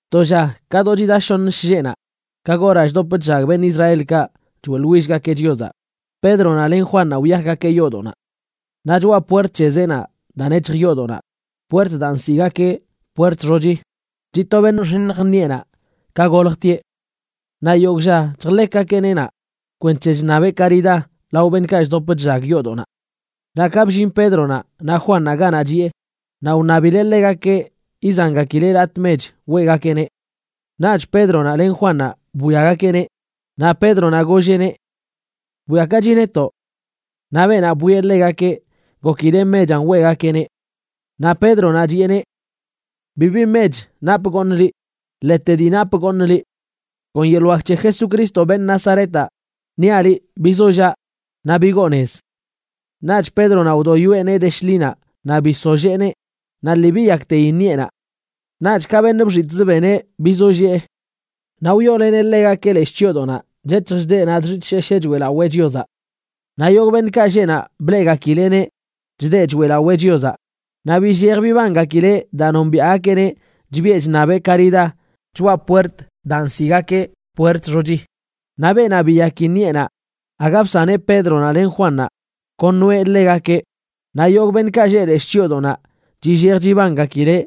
To lla do ka chida shoṉə shlleꞌnaꞌ, ka goraꞌ chdop chllag beṉꞌ Israelkaꞌ choeꞌḻwillgakeꞌ Chiozaꞌ, Pédronaꞌ len Juannaꞌ wyajgakeꞌ yoodoꞌnaꞌ. Naꞌ choꞌa puert c̱he zeenaꞌ daa nec̱hj yoodoꞌnaꞌ, puert daa nsiꞌgakeꞌ Puert Xochi, chiꞌ to beṉꞌ nxiṉj ṉiꞌenaꞌ ka goljtieꞌ. Naꞌ yogꞌ lla chjḻekgakeꞌneꞌ naꞌ kwenc̱he chṉabeꞌ karidá lao beṉꞌkaꞌ chdop chllag yoodoꞌnaꞌ. Naꞌ ka bllin Pédronaꞌ naꞌ Juannaꞌ ganaꞌ chiꞌe, naꞌ wṉabileꞌ ḻegakeꞌ izangakileꞌ latꞌ mech weꞌgakeꞌneꞌ. Naꞌch Pédronaꞌ len Juannaꞌ bwiagakeꞌneꞌ, naꞌ Pédronaꞌ golleꞌneꞌ: ―Bwiakachi netoꞌ. Naꞌ beenaꞌ bwieꞌ ḻegakeꞌ, gokileꞌ mechanꞌ weꞌgakeꞌneꞌ. Naꞌ Pédronaꞌ chiꞌeneꞌ: ―Bibi mech napꞌ goṉꞌ liꞌ, ḻete dii napꞌ goṉꞌ liꞌ. Kon yeḻꞌ wak c̱he Jesucristo, beṉꞌ Nazaretaꞌ, niaꞌ liꞌ bizollaꞌ naꞌ bigoo nez. Naꞌch Pédronaꞌ wdoyoeꞌ nee de shḻinaꞌ naꞌ bisolléeneꞌ, naꞌ lii biyakteyi ṉiꞌenaꞌ. Naꞌch ka beṉꞌ bxitꞌzə beneꞌ bizollee. Naꞌ wyooleneꞌ ḻegakeꞌ leshꞌ chyoodoꞌnaꞌ chec̱hj chdeꞌ naꞌ chxitꞌshesheꞌ choeꞌlawee Chiozaꞌ. Naꞌ yogꞌ beṉꞌkaꞌ lleꞌ naꞌ bleꞌgakileꞌneꞌ chdeꞌ choeꞌlawee Chiozaꞌ, naꞌ billej bibangakileꞌ daa nombiaꞌgakeꞌneꞌ chbiꞌe chṉabeꞌ karidá choꞌa puert daa nsiꞌgakeꞌ Puert Xochi. Naꞌ beenaꞌ biyaki ṉiꞌenaꞌ aga bsaneꞌ Pédronaꞌ len Juannaꞌ, kon noeꞌ ḻegakeꞌ. Naꞌ yogꞌ beṉꞌkaꞌ lleꞌ leshꞌ chyoodoꞌnaꞌ chillej chibangakileꞌ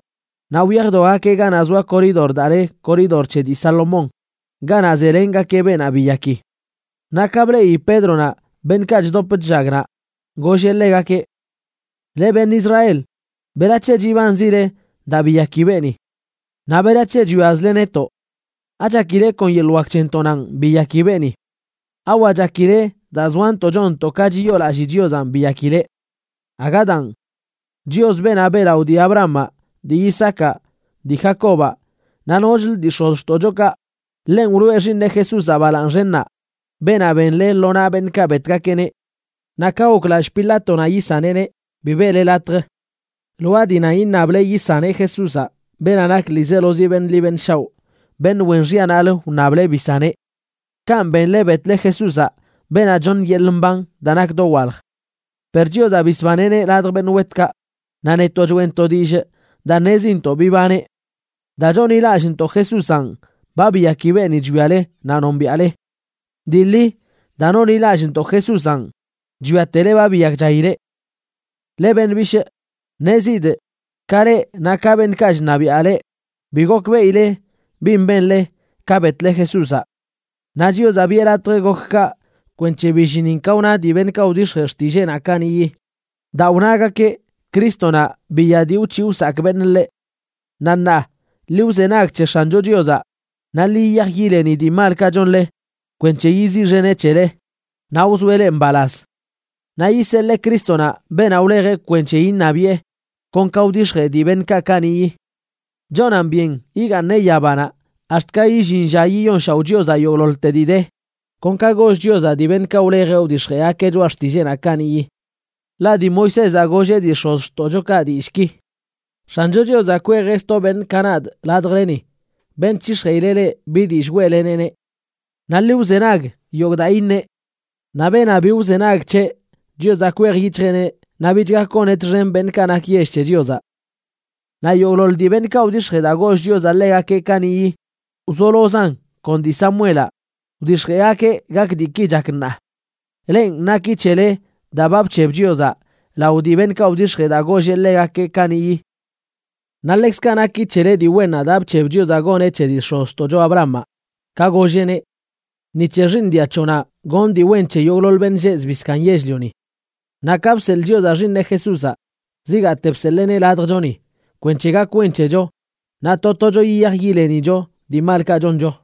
naꞌ wyajdogakeꞌ ganaꞌ zoa koridor daa le Koridor C̱he dii Salomón ganaꞌ zelengakeꞌ beenaꞌ biyaki. Naꞌ ka bleꞌi Pédronaꞌ beṉꞌkaꞌ chdop chllag naꞌ, golleꞌ ḻegakeꞌ: ―Leꞌ beṉꞌ Israel, ¿berac̱he chibanzile daa biyaki beeni? ¿Naꞌ berac̱he chwiazle netoꞌ? ¿Achakile kon yeḻꞌ wak c̱hentoꞌnanꞌ biyaki beeni? ¿Awa chakile daa zoantoꞌ chonntoꞌ ka chiyoolallii Chiozanꞌ biyakileꞌ? Aga daan. Chios, beenaꞌ beꞌlaꞌo dii Abrahamaꞌ, dii Isaacaꞌ, dii Jacobaꞌ, naꞌ nochlə dii x̱oztoꞌchokaꞌ, ḻenꞌ wloꞌe Xiiṉeꞌ Jesúzaꞌ balaaṉ xennaꞌ, beenaꞌ benle lo naꞌ beṉꞌkaꞌ betgakeꞌneꞌ. Naꞌ ka goklallꞌ Pilátonaꞌ yisaneꞌneꞌ, bi beꞌle latj. Lwaa dii nan iṉable yisaneꞌ Jesúzaꞌ, beenaꞌ nak ḻiizelozi beṉꞌ ḻi beṉꞌ shaoꞌ, beṉꞌ wen xyanaꞌlə wṉable bisaneꞌ. Kanꞌ benle betle Jesúzaꞌ, beenaꞌ choṉ yeḻꞌ mban daa nak dowalj. Per Chiozaꞌ bisbaneꞌneꞌ ladj beṉꞌ wetkaꞌ, naꞌ netoꞌ choeꞌntoꞌ dillꞌ daa ṉezintoꞌ bibaneꞌ. Daa chonḻilallꞌntoꞌ Jesúzanꞌ, ba biyaki beeni chwiale naꞌ nombiaꞌle. Dii ḻi, daa nonḻilallꞌntoꞌ Jesúzanꞌ chwiatele ba biyakchaileꞌ. ’Leꞌ beṉꞌ bishꞌ, ṉezidꞌ, ka leꞌ naꞌ ka beṉꞌkaꞌ chṉabiaꞌ leꞌ, bi gokbeꞌile bin benle ka betle Jesúzaꞌ. Naꞌ Chiozaꞌ biꞌe latj gok kaꞌ kwenc̱he billinin ka wna dii beṉꞌkaꞌ wdix̱jee xtilleenaꞌ kaniꞌyi, daa wnagakeꞌ Crístonaꞌ biya dii wc̱hiꞌ wsakꞌ beṉꞌ ḻeꞌ. Naꞌ ṉaa, ḻi wzenag c̱he X̱ancho Chiozaꞌ, naꞌ ḻi yiyaj yileni dii malkaꞌ chonle kwenc̱he yiziꞌxeneꞌ c̱hele naꞌ wzoeꞌ leꞌ mbalaz. Naꞌ yiseḻee Crístonaꞌ, beenaꞌ wlejeꞌ kwenc̱he iṉabiꞌe, kon ka wdix̱jee dii beṉꞌkaꞌ kaniꞌyi. Chonan byen yigaaṉeꞌ yabanaꞌ ax̱t ka illin lla yiyonshaoꞌ Chiozaꞌ yogꞌḻoḻte dii de, kon ka goll Chiozaꞌ dii beṉꞌkaꞌ wlejeꞌ wdix̱jeꞌgakeꞌ choꞌa xtilleenaꞌ kaniꞌyi. Ḻaꞌ dii Moisézaꞌ golleꞌ dii x̱ozxtoꞌchokaꞌ dillꞌki: “X̱ancho Chiozaꞌ kwejeꞌ sto beṉꞌ ka nadꞌ ladjleni, beṉꞌ c̱hix̱jeꞌileꞌ leꞌ bi dillꞌ weꞌleneꞌneꞌ. Naꞌ ḻi wzenag yogꞌ daa iṉeꞌ. Naꞌ beenaꞌ bi wzenag c̱heꞌ, Chiozaꞌ kwej yic̱hjeꞌneꞌ naꞌ bich gak goneꞌ txen beṉꞌkaꞌ nak yell c̱he Chiozaꞌ.” ’Naꞌ yogꞌḻoḻ dii beṉꞌkaꞌ wdix̱jee daa goll Chiozaꞌ ḻegakeꞌ kaniꞌyi, wzolozan kon dii Samuelaꞌ, wdix̱jeꞌgakeꞌ gak diiki chak ṉaa. Lenꞌ, naki c̱hele daa ba bc̱heb Chiozaꞌ lao dii beṉꞌkaꞌ wdix̱jee daa golleꞌ ḻegakeꞌ kaniꞌyi. Naꞌ ḻekzkaꞌ naki c̱hele dii wennaꞌ daa bc̱heb Chiozaꞌ goneꞌ c̱he dii x̱ozxtoꞌcho Abrahamaꞌ, ka golleꞌneꞌ: “Ni c̱he xiiṉ dia c̱hoꞌnaꞌ gonꞌ dii wen c̱he yogꞌḻoḻ beṉꞌ lleꞌ zbii zkaaṉ yell-lioni.” Naꞌ ka bseḻꞌ Chiozaꞌ Xiiṉeꞌ Jesúzaꞌ, zigaate bseḻeeneꞌ ladjchoni kwenc̱he gak wen c̱hecho naꞌ to tocho yiyaj yilenicho dii malkaꞌ choncho.